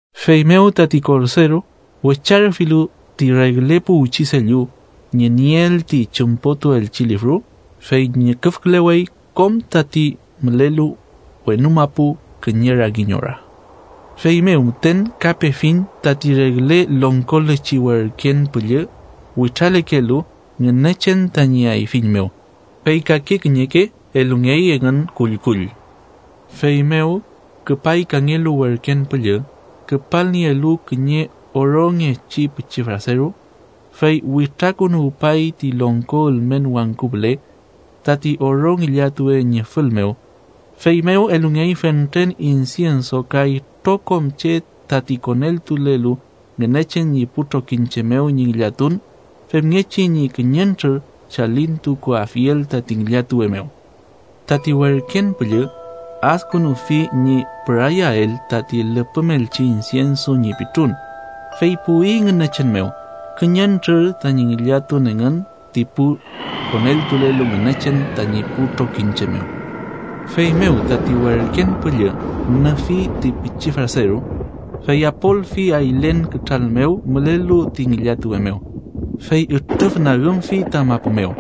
Feymew tati Korderu wecharüfilu ti regle puwchi sellu ñi nieel ti chümpotuelchi lifru, fey ñüküfkülewey kom tati mülelu wenu mapu kiñe rangiñ ora. Feymew müten ka pefiñ tati regle longkolechi werken püllü witralekelu Ngünechen tañi ayfiñ mew, fey kake kiñeke elungey engün kullkull. Feymew küpay kangelu werken püllü, küpalnielu kiñe orongechi pichi fraseru, fey witrakünuwpay ti longko ülmen wangku püle, tati oro ngillatuwe ñi fül mew. Feymew elungey fentren insienso ka itrokom che tati koneltulelu Ngünechen ñi pu trokiñche mew ñi ngillatun, femngechi ñi kiñentrür chalintukuafiel tati ngillatuwe mew. Tati werken püllü adkünufi ñi pürayael tati lüpümelchi insienso ñi pitrun, fey puwi Ngünechen mew, kiñentrür tañi ngillatun engün ti pu koneltulelu Ngünechen tañi pu trokiñche mew. Feymew tati werken püllü nüfi ti pichi fraseru, fey apolfi aylen kütral mew mülelu ti ngillatuwe mew, fey ütrüfnagümfi ta mapu mew.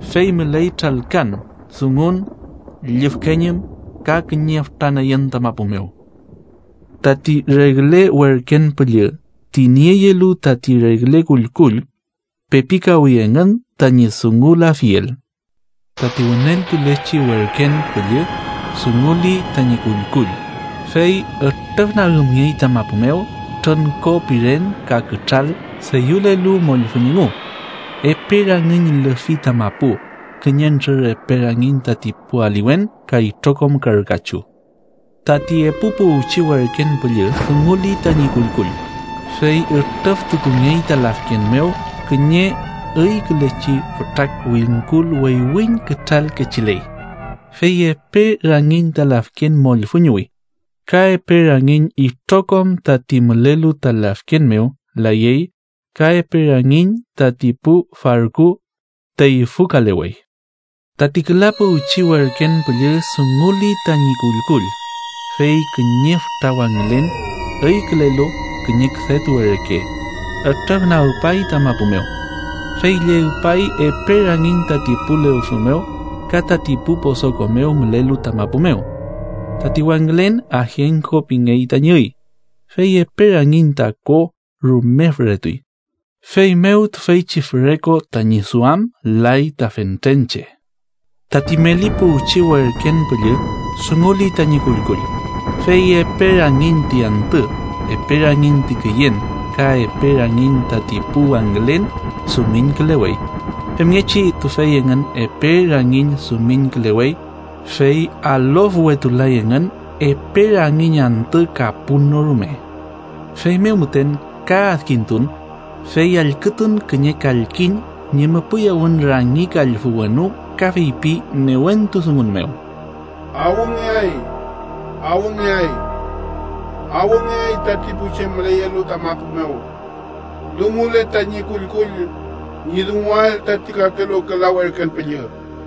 Fey müley tralkan, dungun, llüfkeñün ka kiñe fütra nüyün ta mapu mew. Tati regle werken püllü ti nieyelu tati regle kullkull pepikawi engün tañi dungulafiel. Tati wüneltulechi werken püllü dunguli tañi kullkull, fey ütrüfnagümngey ta mapu mew trüngko piren ka kütral deyülelu mollfüñ engu. Epe rangiñ lüfi ta mapu, kiñentrür epe rangiñ tati pu aliwen ka itrokom karü kachu. Tati epu puwchi werken püllü dunguli tañi kullkull, fey ütrüftukungey ta lafken mew kiñe üykülechi fütra wingkul weywiñ kütral kechiley. Fey epe rangiñ ta lafken mollfüñuwi. Ka epe rangiñ itrokom tati mülelu ta lafken mew, layey, ka epe rangiñ tati pu farku teyfükalewey. Tati küla puwchi werken püllü dunguli tañi kullkull, fey kiñe fütra wangülen, üykülelu kiñe küdetuwe reke, ütrüfnagpay ta mapu mew, fey llegpay epe rangiñ tati pu lewfü mew ka tati pu posoko mew mülelu ta mapu mew. Tati wangülen Ajenko pingey tañi üy. Fey epe rangiñ ta ko rume füretuy, feymew tüfeychi füre ko tañi duam lay ta fentren che. Tati meli puwchi werken püllü dunguli tañi kullkull, fey epe rangiñ ti antü, epe rangiñ ti küyen ka epe rangiñ tati pu wangülen dumiñkülewey. Femngechi tüfey engün epe rangiñ dumiñkülewey, fey alofwetulay engün epe rangiñ antü ka pun no rume. Feymew müten ka adkintun, fey allkütun kiñe kalkiñ ñi müpüyawün rangi kallfü wenu ka feypi newentu dungun mew: “¡Awngeay, awngeay, awngeay tati pu che müleyelu ta mapu mew, dungule tañi kullkull ñi dungulael tati kakelu küla werken püllü!”